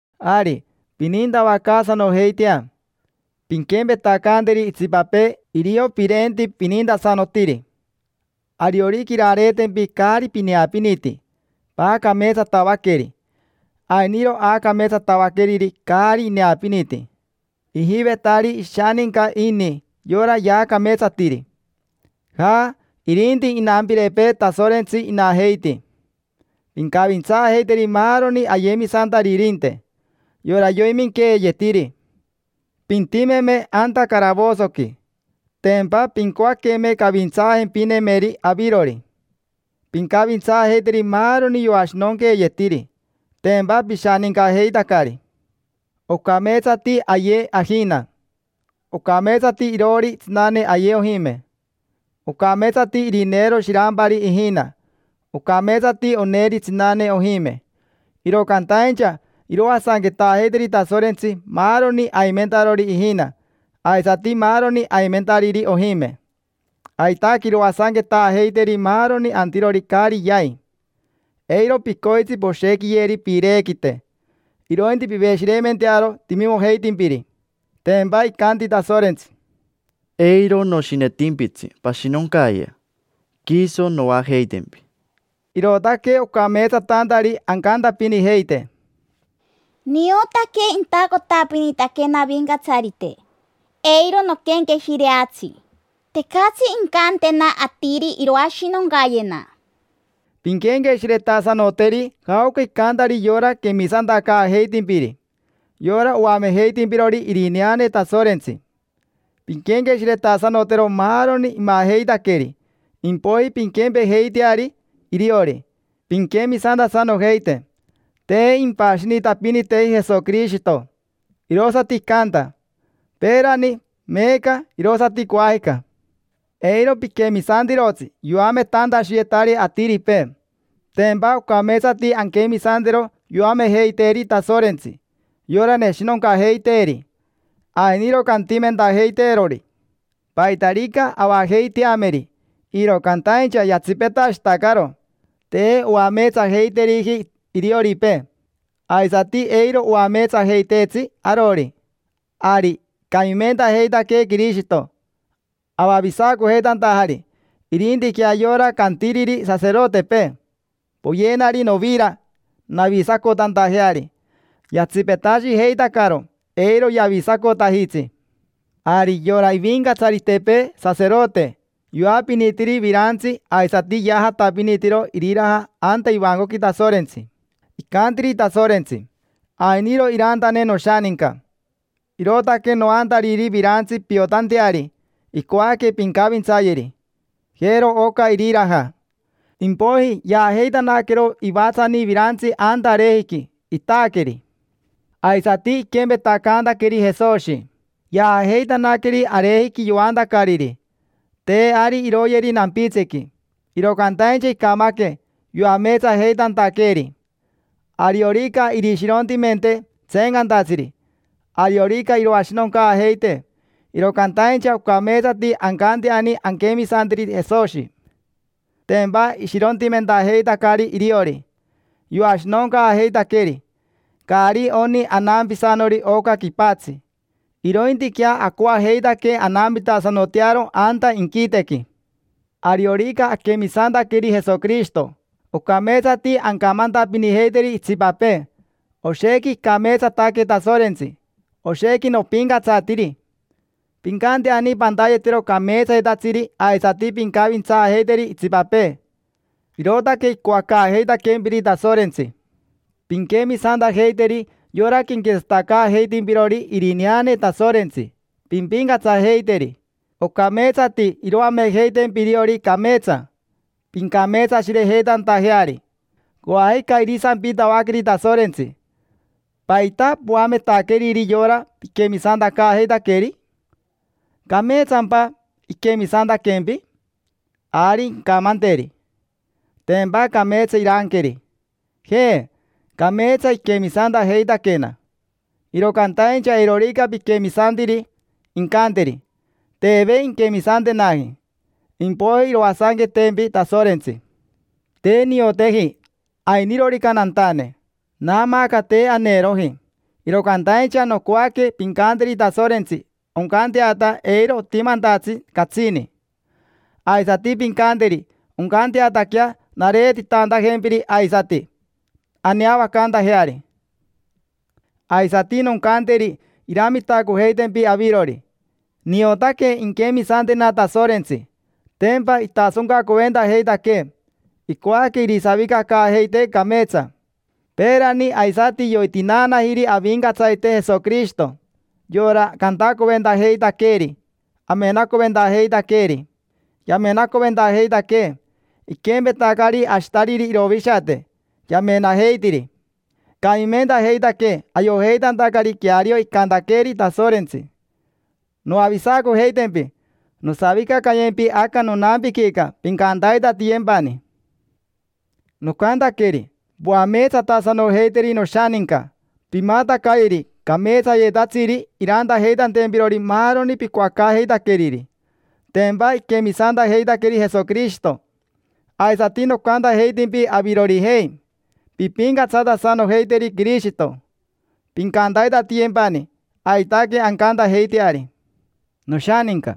Ari, pinintavacaasanojeitea: pinquempetacanteri itsipapee irio pirenti pinintasanotiri. Ariorica irareetempi caari pineapiniti, paacameetsatavaqueri. Ainiro aacameetsatavaqueriri caari ineapiniti, ijivetari ishaninca ini yora yaacameetsatiri: jaa, irinti inampirepee Tasorentsi inajeiti. Pincavintsaajeiteri maaroni ayemisantaririnte, yora yoiminqueeyetiri: pintimeme anta caravosoqui, tempa pincoaqueme cavintsaajempinemeri avirori. Pincavintsaajeiteri maaroni yoashinonqueeyetiri: tempa pishanincajeitacari. Ocameetsati aye ajina; ocameetsati iroori tsinane aye ojime. Ocameetsati irineero shirampari ijina; ocameetsati oneeri tsinane ojime. Iro cantaincha iroasanquetaajeiteri Tasorentsi maaroni aimentarori ijina aisati maaroni aimentariri ojime. Aitaque iroasanquetaajeiteri maaroni antirori caari yai. Eiro picoitsi poshequiyeri piirequite, irointi piveshireimentearo timimojeitimpiri. Tempa icanti Tasorentsi: “Eiro noshinetimpitsi pashinoncayea, quiso noajeitempi”. Irootaque ocameetsatantari ancantapinijeite: “Niotaque intacotapinitaquena Avincatsarite, eiro noquenqueshireatsi. Tecatsi incantena atiri iroashinoncayena”. Pinquenqueshiretasanoteri jaoca icantari yora quemisantacaajeitimpiri: yora oamejeitimpirori irineane Tasorentsi. Pinquenqueshiretasanotero maaroni imajeitaqueri, impoiji pinquempejeiteari iriori, pinquemisantasanojeite. Te impashinitapiniteji Jesoquirishito, irosati icanta: peerani, meeca, irosati coajica. Eiro piquemisantirotsi yoametantashiyetari atiripee. Tempa ocameetsati anquemisantero yoamejeiteeri Tasorentsi, yora neshinoncajeiteeri. Ainiro cantimentajeiteerori paitarica avajeiteameri, iro cantaincha yatsipetashitacaro: te oameetsajeiteriji irioripee, aisati eiro oameetsajeiteetsi arori. Ari icamimentajeitaquee Quirishito, avavisacojeitantajari; irintiquea yora cantiriri saserotepee: “Poyenari novira navisacotantajeari”, yatsipetashijeitacaro, eiro yavisacotajitsi. Ari yora ivincatsaritepee saserote yoapinitiri virantsi aisati yaajatapinitiro iriraja anta ivancoqui Tasorentsi. Icantiri Tasorentsi: “Ainiro irantane noshaninca, irootaque noantariri virantsi piotanteari icoaque pincavintsayeri. Jero oca iriraja”. Impoiji yaajeitanaquero ivatsani virantsi anta arejiqui, itaaqueri. Aisati iquempetacantaqueri Jesoshi, yaajeitanaqueri arejiqui yoantacariri: te ari iroyeri nampitsiqui. Iro cantaincha icamaque yoameetsajeitantaqueeri. Ariorica irishirontimentee tseencantatsiri, ariorica iroashinoncaajeitee, iro cantaincha ocameetsati ancanteani anquemisanteri Jesoshi. Tempa ishirontimentajeitacari iriori, yoashinoncaajeitaqueri. Caari oni anampisanori oca quipatsi, irointiquea acoajeitaque anampitasanotearo anta inquitequi. Ariorica aquemisantaqueri Jesoquirishito, ocameetsati ancamantapinijeiteri itsipapee: “Oshequi icameetsataque Tasorentsi, oshequi nopincatsatiri”. Pincanteani pantayetero cameetsayetatsiri aisati pincavintsaajeiteri itsipapee: irootaque icoacaajeitaquempiri Tasorentsi. Pinquemisantajeiteri yora quenquetsatacaajeitimpirori irineane Tasorentsi, pimpincatsajeiteri. Ocameetsati iroamejeitempi iriori cameetsa, pincameetsashirejeitantajeari. Coajica irisampitavaqueri Tasorentsi: “¿Paita poametaqueriri yora piquemisantacaajeitaqueri? ¿Cameetsampa iquemisantaquempi?” Ari incamanteri. Tempa cameetsa iranqueri: “Je, cameetsa iquemisantajeitaquena”. Iro cantaincha eirorica piquemisantiri, incanteri: “Teve inquemisantenaji”, impoiji iroasanquetempi Tasorentsi. Te nioteji ainirorica nantane, naamaaca te aneroji; iro cantaincha nocoaque pincanteri Tasorentsi oncanteata eiro otimantatsi catsini. Aisati pincanteri oncanteataquea nareetitantajempiri aisati, aneavacantajeari. Aisati noncanteri iramitacojeitempi avirori. Niotaque inquemisantena Tasorentsi, tempa itasoncacoventajeitaquee: icoaque irisavicacaajeitee cameetsa. Peerani aisati yoitinaanajiri Avincatsarite Jesoquirishito: yora cantacoventajeitaqueeri, amenacoventajeitaqueeri. Yamenacoventajeitaquee, iquempetacari ashitariri irovishate, yamenajeitiri. Icamimentajeitaquee ayojeitantacari queario icantaqueeri Tasorentsi: “Noavisacojeitempi, nosavicacayempi aca nonampiquica, pincantaitatiyempani”. Nocantaqueri: “Poameetsatasanojeiteri noshaninca, pimatacayeri cameetsayetatsiri irantajeitantempirori maaroni picoacaajeitaqueriri: tempa iquemisantajeitaqueri Jesoquirishito”. Aisati nocantajeitimpi avirorijei: “Pimpincatsatasanojeiteri Quirishito, pincantaitatiyempani. Aitaque ancantajeiteari”. Noshaninca,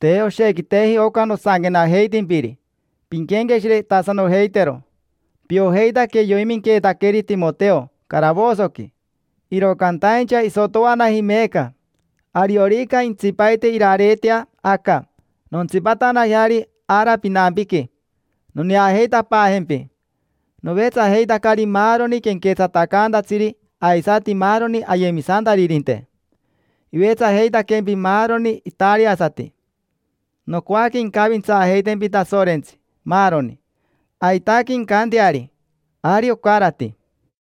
te oshequiteji oca nosanquenajeitimpiri: pinquenqueshiretasanojeitero. Piojeitaque yoiminqueetaqueri Timoteo caravosoqui, iro cantaincha isotoanaji meeca. Ariorica jentsipaite irareetea aca, nontsipatanajeari ara pinampiqui, noneajeitapaajempi. Novetsajeitacari maaroni quenquetsatacantatsiri aisati maaroni ayemisantaririnte. Ivetsajeitaquempi maaroni itariasati. Nocoaque incavintsaajeitempi Tasorentsi, maaroni. Aitaque incanteari. Ari ocarati.